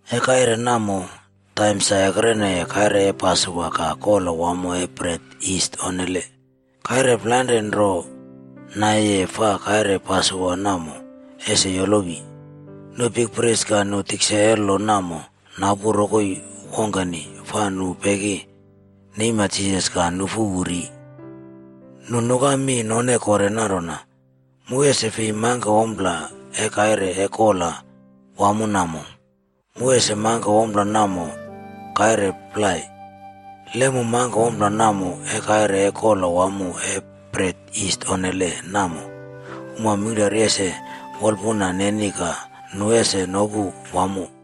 E kaire namo, taim sa ekreneye kaire e Pasowa ka Kola Wamo E Bret Yis Onnele. Kaire plainrane nro naiyeye fa kaire Pasowa namo ese yolowi. Nu bikpris ka nu tikse e lo namo napu rokoi wongkeni fa nu peki neima Jisas ka nufu wu ri. Nu nuka mi none kore nanrona, “Mu ese fi mangke ompla e kaire e kola wamo namo. Mu ese mangke ompla namo kaire plai. Le mu mangke ompla namo e kaire e Kola Wamo E Bret Yis Onnele namo, uma mingklari ese wolpuna neni ka nu ese nopu wamo.”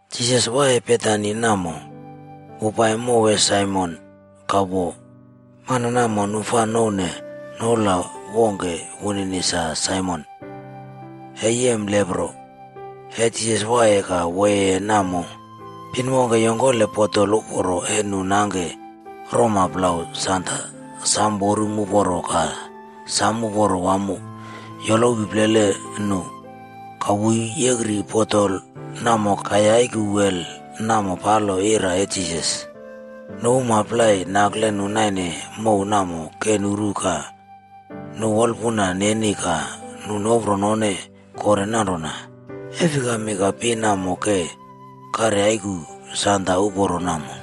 Jisas waiye Betani namo, wu pai mow e Saimon ka wo. Mana namo nu fa nouwne noula wongke wunini sa Saimon e Yem Lepro. E Jisas waiye ka woyeye namo, pin wongke yongkole botol uporo e nu nangke roma plau sanda sam worum uporo ka sam uporo wamo yolowi plele nu. Ka wu yekri botol namo ka yaiku wel namo palo ira e Jisas. Nu uma plai nakle nu naine mow namo ke nuru ka nu wolpun neni ka nu nopro none kore nanrona, “E fikami ka pin namo ke karyaiku sanda uporo namo?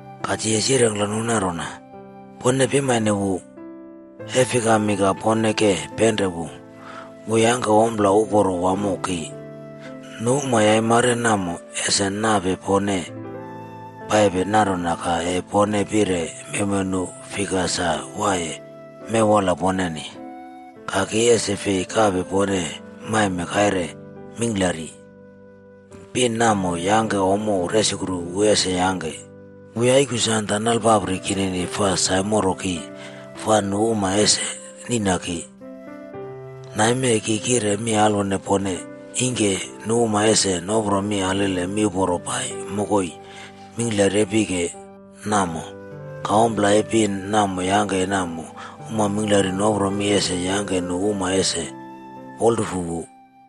Ka Jisas yirengkle nu nanrona, “Pone pimane wu. E fikami ka pone ke penre wu? Wu yangke ompla uporo wamo ki. Nu uma yaimare namo, ese nape pone paipe nanrona ka e pone pire mewmew nu fika sa waiye mewola poneni. Ka ki ese fei kape pone maime kaire mingklari. Pin namo yangke ompla resukru wu ese yangke. Wu yaiku sanda nalpapri kinini fa saimoro ki fa nu uma ese niꞌna ki. Name ki kire mi alwone pone, ingke nu uma ese nopro mi alele miuporo pai mokoi mingklari e pike namo. Ka ompla e pin namo yangke namo, uma mingklari nopro mi ese yangke nu uma ese wolrufu wu.”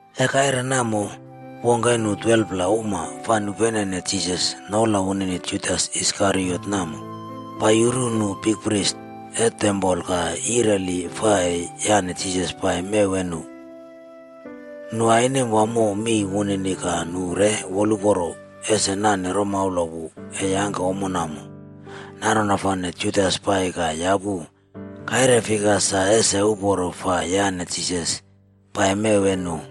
E kaire namo, wongke e nu 12pla uma fai nupenene Jisas noula wunini Judas Iskariot namo, pai yuru nu bikpris e tempol ka yireli fa e yane Jisas pai mew e nu. Nu ainem wamo mi wunini ka nu re woluporo ese nane romaula wu e yangke ommo namo. Nanrona fane Judas pai ka yapu kaire rongkele sa ese uporo fai yane Jisas pai mew e nu.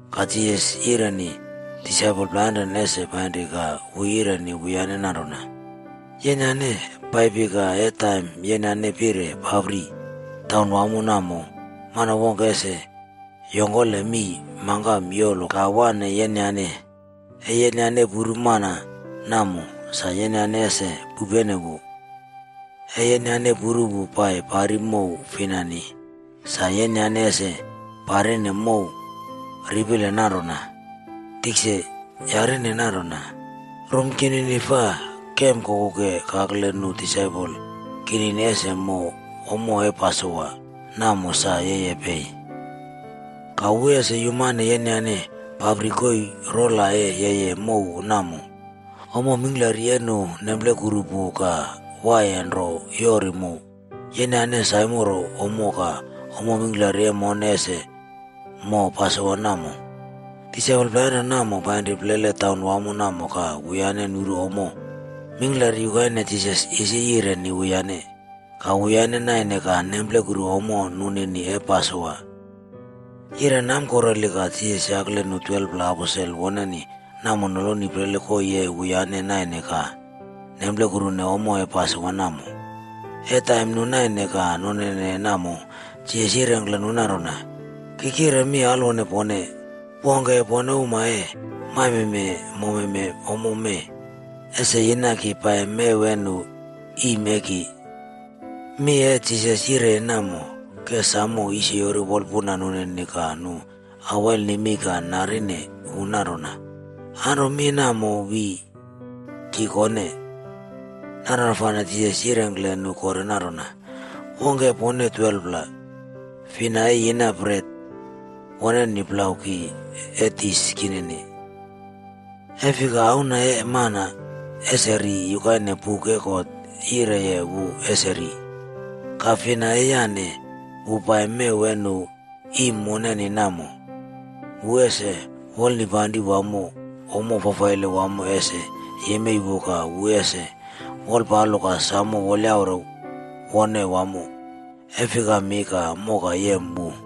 Ka Jisas yireni disaipol plainrane ese painri ka wu yireni wuyane nanrona, “Yenyane paipi ka e taim yenyane pire papri taunwamo namo, mana wongke ese yongkole mii mangkam yolowi ka wane yenyane. E yenyane puru mana namo, sa yenyane ese pupene wu. E yenyane puru wu pai pari mow finani, sa yenyane ese parine mow ripele nanrona, ‘Tikse yari nanrona, “Rum kinini fa kemkoku kakle nu disaipol kinini ese mo ommo e Pasowa namo sa yeye pei?” ’ Ka wu ese yumane yenyane paipapri koii rola e yeye mow namo. Ommo mingklari e nu nemplekuru pu ka waiye nro yoru mu. Yenyane saimoro ommo ka ommo mingklari e mone ese mo pasowa namo.” Disaipol plainrane namo painri plele taunwamo namo ka wuyane nuru ommo mingklari yukaine Jisas isi yireni wuyane. Ka wuyane naine ka nemplekuru ommo nunini e Pasowa. Yire namkureli ka Jisas yakle nu 12pla aposel woneni namo noloni plele koii e wuyane naine ka nemplekuru ommo e Pasowa namo. E taim nu naine ka none namo, Jisas yirengkle nu nanrona, “Ki kire mi alwone pone, wongke e pone uma e maime mome ommo mee, ese yina ki pai mew e nu iim e ki.” Mi e Jisas yire namo ke samo yisyori wolpuna nunini ka nu awail nemei ka narine wu nanrona, “Anro mi namo wi ki kone?” Nanrona fane Jisas yirengkle nu kore nanrona, “Wongke e pone 12pla. Fina e yina bret woneni plau ki e dis kinini. E fika Auna E Mana ese ri yukaine buk e God yireye wu ese ri. Ka fina e yane wu pai mew e nu iim wunini namo, wu ese wolnipanri wamo ommo fafaile wamo ese yemei wu ka wu ese wolpalo ka samo wolyaure wone wamo. E fikami ka moka yem wu?”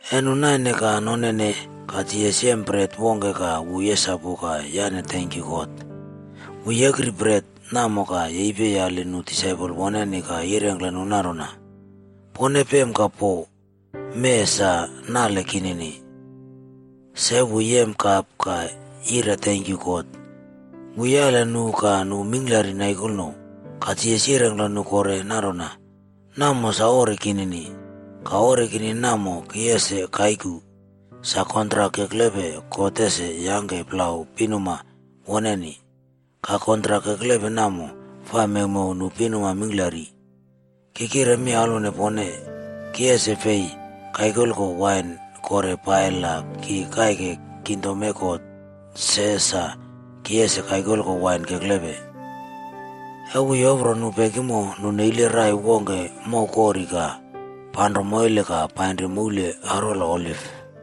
E nu naine ka nonene ka Jisas yem bret wongke ka wu yesapu ka yane tenkyu God. Wu yekri bret namo ka yepi yali nu disaipol woneni ka yirengkle nu nanrona, “Pone pem ka po. Mee sa nale kinini.” Se wu yem kap ka yire tenkyu God. Wu yali nu ka nu mingklari naikolno. Ka Jisas yirengkle nu kore nanrona, “Namo sa ori kinini. Ka ori namo ki ese kaiku, sa kontrak keklepe God ese yangke plau pinuma woneni. Ka kontrak keklepe namo fa mewmew nu pinuma mingklari. Ki kire mi alwone pone, ki ese fei kaikoko wain kore pai la ki kaike kingdom e God se sa ki ese kaikoko wain keklepe.” E wu yopro nu pekimo, nu neile rai wongke mowkori ka panro moile ka painri moul arwola Oliv.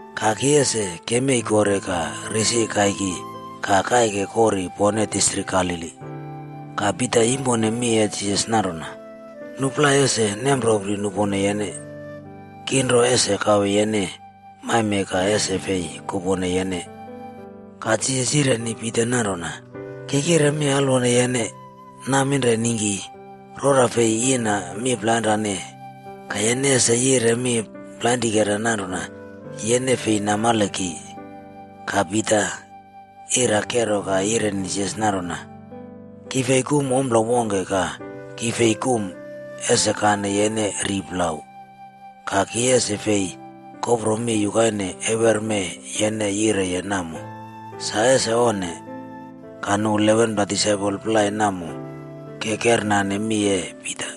Ka ki ese kemei kore ka risi kaiki ka kaike kori pone distrik Galili.” Ka Pita yimpone mi e Jisas nanrona, “Nu plai ese nemropri nupone yene. Ki nro ese kawe yene maime ka ese fei kupone yene.” Ka Jisas yireni Pita nanrona, “Ki kire mi alwone yene, naminre ningki, rora fei yina mi plainrane ka yene ese yire mi plainrikera nanrona yene fei namale ki.” Ka Pita ira kero ka yireni Jisas nanrona, “Ki fi kum ompla wongke ka ki fi kum ese kane yene ri plau. Ka ki ese fei kopro mi yukaine eweremee yene yireye namo. Sa ese onne!” Ka nu 11pla disaipol plai namo ke kernane mi e Pita.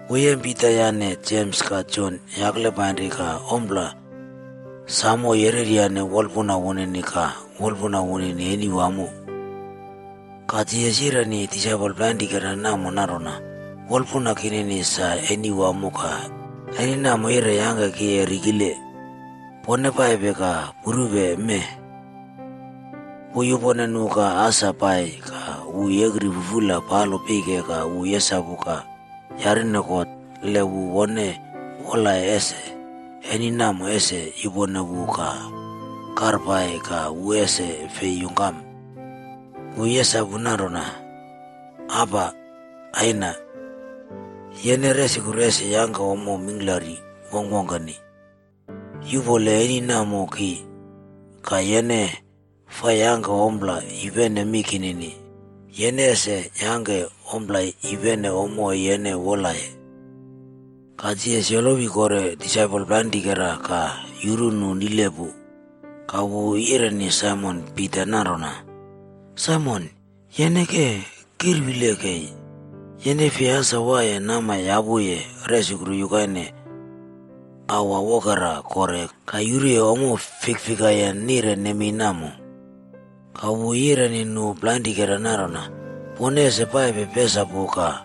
Wu yem Pita yane Jems ka Jon yakle painri ka ompla samo yereryane wolpuna wunini ka wolpuna wunini eni wamo. Ka Jisas yireni disaipol plainrikera namo nanrona, “Wolpuna kinini sa eni wamo ka eni namo yire yangke ki rikile. Pone paipe ka purupe mee.” Wu yupone nu ka asa pai ka wu yekri fufula palo pike ka wu yesapu ka yarine God le wu wone wolaye ese eni namo ese yupone wu ka karpai ka wu ese fei yungkam. Wu yesapu nanrona, “Aba Aina, yene resukru ese yangke ommo mingklari wongkwongkeni. Yuꞌpole eni namo ki. Ka, yene faa yangke ompla yupene mi kinini, yene ese yangke ompla yupene ommo e yene wolaye.” Ka Jisas yolowi kore disaipol plainrikera ka yuru nu nile pu. Ka wu yireni Saimon Pita nanrona, “Saimon, yene ke kirwile kei! Yene fei asa waiye nama yapuye resukru yukaine aua wokera kore ka yuruye ommo fikfikayen nire nemei namo?” Ka wu yireni nu plainrikera nanrona, “Pone ese paipe pesapu ka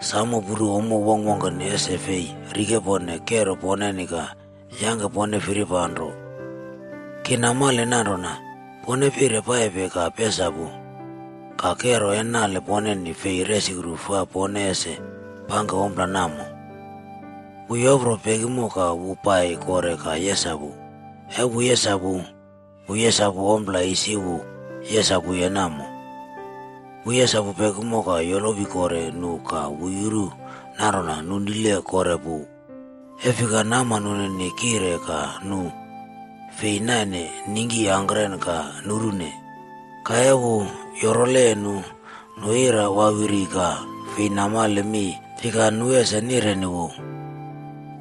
samo puru ommo wongkwongkeni ese fei rikepone kero poneni ka yangke pone firipaplo. Ki namale nanrona pone pire paipe ka pesapu, ka kero e nale poneni fei resukru fa pone ese pangke ompla namo.” Wu yopro pekimo ka wu pai kore ka yesapu. E wu yesapu, wu yesapu ompla isi wu yesapuye namo. Wu yesapu pekimo ka yolowi kore nu ka wu yuru nanrona nu nile kore pu. E fika nama nunini kire ka nu fei naine ningki angkren ka nurune. Ka e wu yorole nu, nu ira wawiri ka fei namale mi fika nu ese nireni wu.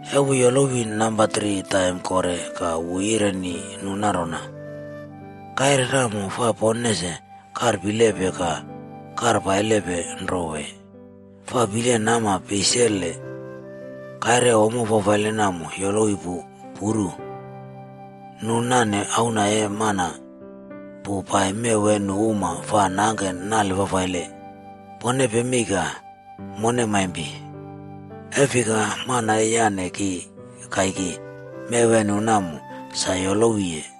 E wu yolowi namba tri taim kore ka wu yireni nu nanrona, “Kire namo fa pone ese karpilepe ka karpailepe nro wee? Faa pile nama peisele! Kaire e ommo fafaile namo yolowi pu. Puru, nu nane Auna E Mana pu pai mew e nu uma fa nangke nale fafaile. Pone pemei ka mone maimpi. E fika mana e yane ki kaiki mew e nu namo, sa yolowiye.”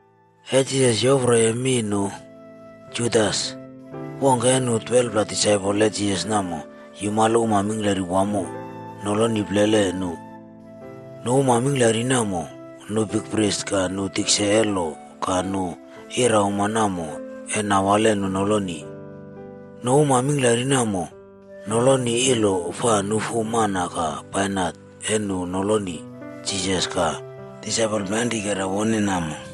E Jisas yoproye mi nu, Judas, wongke e nu 12pla disaipol e Jisas namo yumale uma mingklari wamo noloni plele nu. Nu uma mingklari namo, nu bikpris ka nu tikse e lo ka nu irauma namo e nawale nu noloni. Nu uma mingklari namo nongkole ilo fa nufu mana ka bainat e nu noloni Jisas ka disaipol plainrikera woneni namo.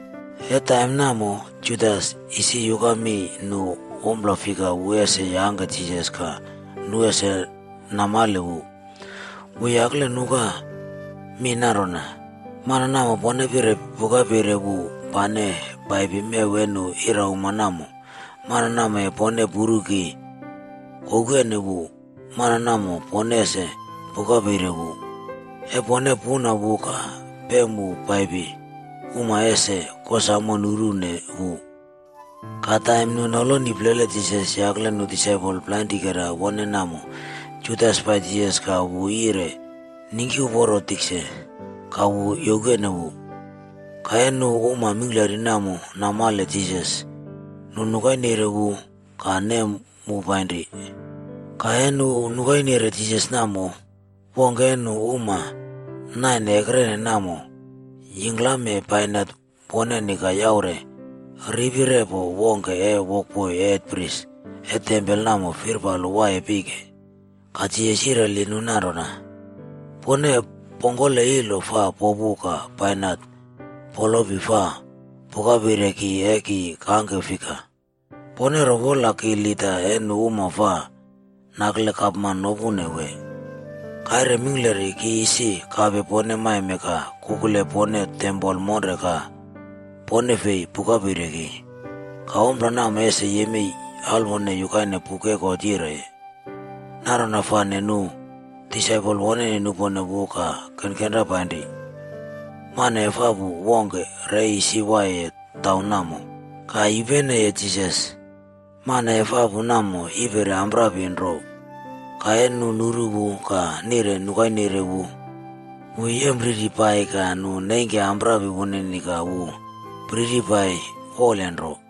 E taim namo, Judas isi yuka mi nu ompla fika wu ese yangke Jisas ka nu ese namale wu. Wu yakle nuka mi nanrona, “Mana namo pone pire pukapeire wu pane pai mew e nu irauma namo, mana namo e pone puru ki koukene wu, mana namo pone ese pukapeire wu. E pone puna wu ka pem wu pai, uma ese kosamo nurune wu.” Ka taim nu noloni plele Jisas yakle nu disaipol plainrikera woneni namo, Judas pai Jisas ka wu yire “Ningki uporo tikse!” ka wu youkene wu. Ka e nu uma mingklari namo namale Jisas, nu nukaire wu ka nem wu painri. Ka e nu nukaire Jisas namo, wongke e nu uma naine ekrene namo yingklame bainat woneni ka yaure ripi repo wongke e wokboi e hetpris e tempol namo firpalo waiye pike. Ka Jisas yireli nu nanrona, “Pone pongkole ilo fa popu ka bainat polopi fa pukaire ki e ki kangke fika? Pone ro wola ki lida e nu uma fa nakle gapman nopune wee? Kaire mingklari ki isi kape pone maime ka kukule pone tempol monre ka pone fei pukaire ki. Ka ompla namo ese yemei alwone yukaine buk e God yireye.” Nanrona fane nu disaipol woneni nupone wu ka kenkenra painri. Mana efapu wongke re isi waiye taim namo, ka yupeneye Jisas. Mana efapu namo yiperi amprapi nro. Ka e nu nuru wu ka nire nukaire wu, wu yempriri pai ka nu nengke amprapi wunini ka wu priri pai wolenro.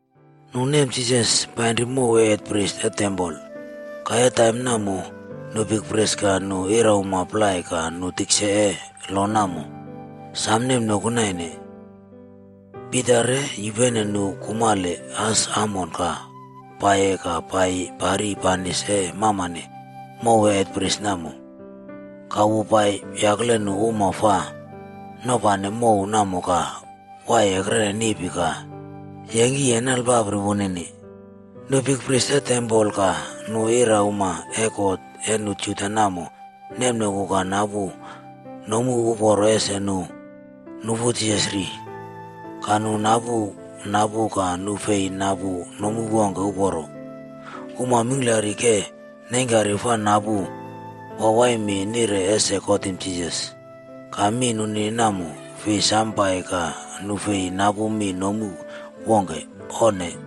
Nu nem Jisas pairi mow e hetpris e tempol. Ka e taim namo, nu bikpris ka nu irauma plai ka nu tikse e lo namo, sa nemnoku naine. Pita re yupene nu kumalpo as amone ka paiye ka pai pari banis e mamane mow e hetpris namo. Ka wu pai yakle nu uma fa nopane mow namo ka waiye ekrene niꞌpi ka yengki nalpapri woneni. Nu bikpris e tempol ka nu irauma e kot e nu Juda namo nemnoku ka napu nomu uporo ese nu nufu Jisas ri. Ka nu napu napu ka nu fei napu nomu wongke uporo. Uma mingklari ke neingkari fa napu waiwai mi nire ese kotim Jisas. Ka mi nunini namo fei sam pai ka nu fei napu mi nomu wongke. Onne.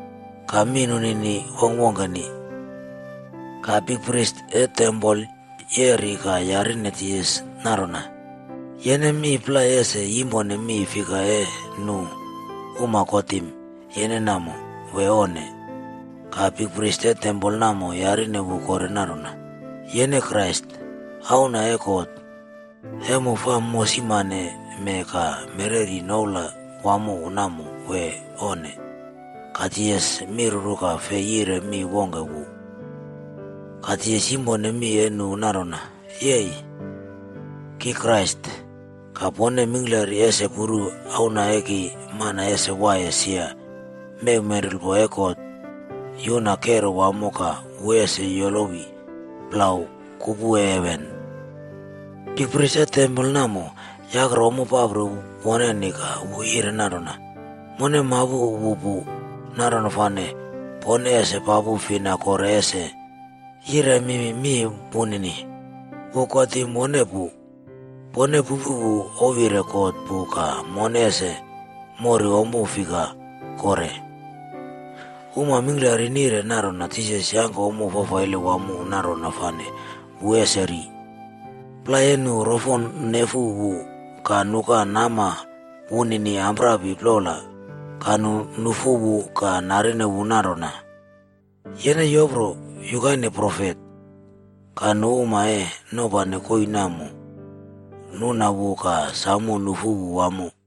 Ka mi nunini wongkwongkeni. Ka bikpris e tempol yeri ka yarine Jisas nanrona, “Yene mi plai ese yimpone mi fika e nu uma kotim yene namo, wee onne?” Ka bikpris e tempol namo yarine wu kore nanrona, “Yene Krais, Auna e God e mu fa mosimaneme ka mereri noula wunini namo wee onne?” Ka Jisas miruru ka fei yire mi wongke wu. Ka Jisas yimpone mi e nu nanrona, “Yei, ki Krais. Ka pone mingklari ese puru Auna e Mana ese waiye sia mew menrulpo e God yuna kero wamo ka wu ese yolowi plau kupu e heven.” Bikpris e tempol namo yakrele ommo papri woneni ka wu yire nanrona, “Mone mapu wu pu. Nanrona fane pone ese papu fina kore ese yiremi mi wunini? Wu kotim wone pu. Pone pupu wu ouwyire God pu ka mone ese moru ompla fika kore?” Uma mingklari nire nanrona Jisas yangke ompla fafaile wamo nanrona fane wu ese ri. Plai e nu rofo nefu wu ka nuka nama wunini amprapi plola ka nu nufu wu ka narine wu nanrona, “Yene yopro yukaine profet!” Ka nu uma e nopane koii namo nuna wu ka samo nufu wu wamo.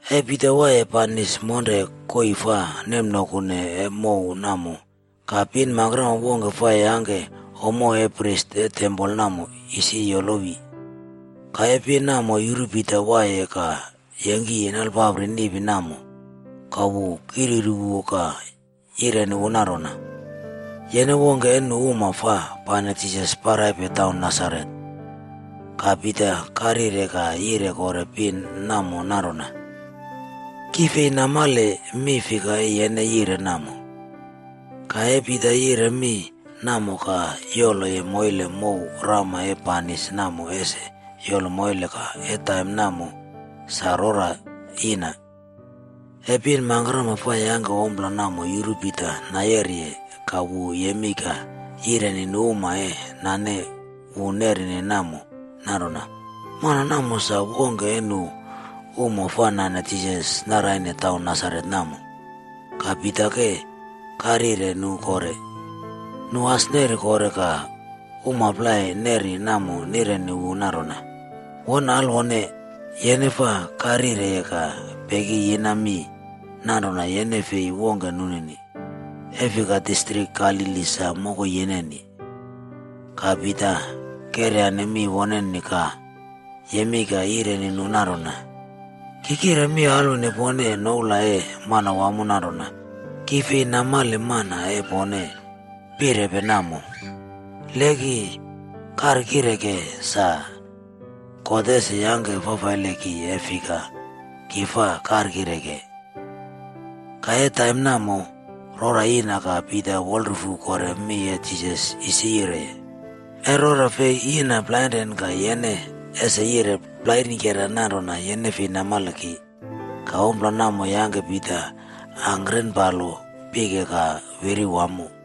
E Pita waiye banis monre koii fai nemnokune e mow namo, ka pin mangkrama wongke fa yangke ommo e bikpris e tempol namo isi yolowi. Ka e pin namo yuru Pita waiye ka yengki nalpapri niꞌpi namo ka wu kiryuru wu ka yireni wu nanrona, “Yene wongke e nu uma fa pane Jisas paraipe taun Nasaret.” Ka Pita karyire ka yire kore pin namo nanrona, “Ki fei namale mi fika e yene yire namo.” Ka e Pita yire mi namo ka yoloye moile mow rama e banis namo ese yolo moile ka e taim namo sa rora yina. E pin mangkrama fa yangke ommo namo yuru Pita nayeriye ka wu yemei ka yireni nu uma e nane wu neri namo nanrona, “Mana namo sa wongke e nu uma fa nane Jisas naraine taun Nasaret namo.” Ka Pita ke karyire nu kore. Nu as neri kore ka uma plai neri namo nireni wu nanrona, “Won alwone, yene faa karyireye ka peki yina mi nanrona yene fei wongke nunini. E fika distrik Galili sa mokoi yeneni.” Ka Pita keryane mi woneni ka yemei ka yireni nu nanrona, “Ki kire mi alwone pone noula e Manawamo nanrona ki fei namale mana e pone pirepe namo. Le ki karkireke sa, God ese yangke fafaile ki e fika ki fa karkireke.” Ka e taim namo, rora yina ka Pita wolrufu kore mi e Jisas isi yire, “E rora fei yina plainrane ka yene ese yire plainrikera nanrona yene fei namale ki.” Ka ompla namo yangke Pita angkren palo pike ka wiri wamo.